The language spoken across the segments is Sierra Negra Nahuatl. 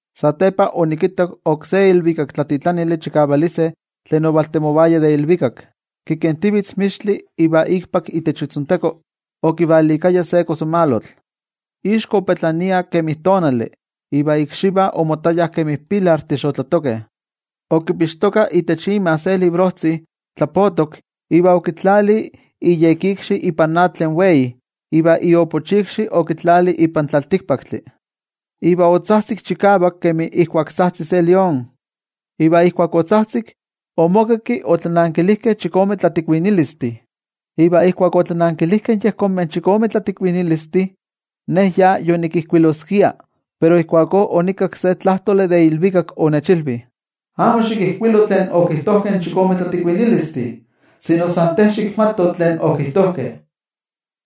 Satepa onikittak oksé ilvikaktlatitlanili chikavalise tlen ovaltemovaya de ilvikak, kikentivitz mixtli iva ikpak itech itzonteko okivalikaya se kosamalotl. Ixko opetlania kemi tonali, iva ikxivah omottayah kemi pilartih xotlatokeh. Okipixtoka itech ima se librojtzi tlapotok, iva okitlali iyekikxi ipan atl tlen wei iva iopochikxi okitlali ipan tlaltikpaktli. Iva otzajtzik chikavak kemi ijkuak tzajtzi se lión. Iva ijkuak otzajtzik, omokakki otlanankilijkeh chikome tlatikuinilistih. Iva ijkuak otlanankilijkeh yejonmeh chikome tlatikuinilistih, ne ya yonikijkuiloskia, pero ijkuakó onikakki se tlajtoli de ilvikak onechilvi: —Amo xikijkuilo tlen okijtojkeh in chikome tlatikuinilistih, sino san te xikmato tlen okijtojkeh.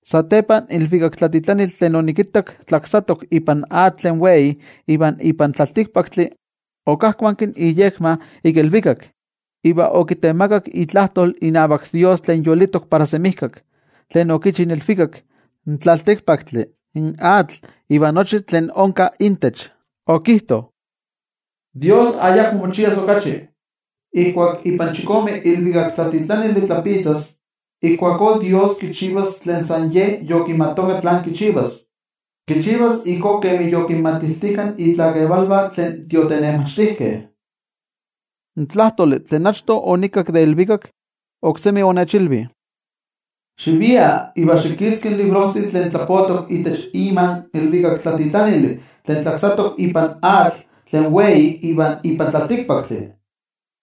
Satepa in ilvikaktlatitlanili tlen onikittak tlaksatok ipan atl tlen wei iva ipan tlaltikpaktli, okajkuanki iyekma ik ilvikak iva okitemakak itlajtol inavak toYejwatzi tlen yolitok para semijkak, tlen okichi in ilvikak, in tlaltikpaktli, in atl iva nochi tlen onka intech. Okijto: —Dios ayakmo mochias okachi. Ijkuak ipan chikome ilvikaktlatitlanili tlapitzas, ijkuakó Dios kichivas tlen san Ye yokimatoka tlán kichivas. Kichivas ijkó kemi yokinmatiltijka itlakevalvah tlen tiotenejmachtijkeh. In tlajtoli tlen achto onikakki de ilvikak, oksemi onechilvi: —Xivia, iva xikitzki in librojtzi tlen tlapotok itech ima in ilvikaktlatitlanili tlen tlaksatok ipan atl tlen wei iva ipan tlaltikpaktli.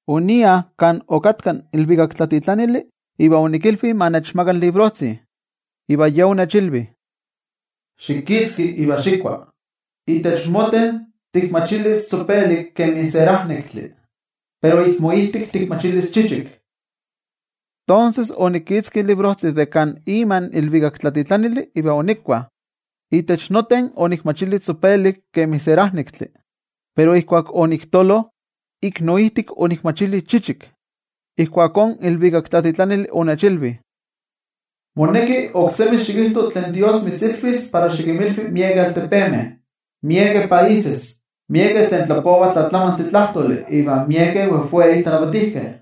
Onia kan okatka in ilvikaktlatitlanili iva onikilvi ma nechmaka in librojtzi, iva ye onechilvi: —Xikitzki iva xikua. Itech moten tikmachilis tzopelik kemi serajnektli, pero ik moijtik tikmachilis chichik. Tonses onikitzki in librojtzi de kan ima in ilvikaktlatitlanili iva onikua. Itech noten onikmachili tzopelik kemi serajnektli, pero ijkuak oniktolo, ik noijtik onikmachili chichik. Ijkuakó in ilvikaktlatitlanili onechilvi: —Moneki oksemi xikijto tlen Dios mitzilvis para xikinmilvi miekeh altepemeh, miekeh países, miekeh tlen tlapovah tlatlamantli tlajtoli iva miekeh wejwei tlanavatijkeh.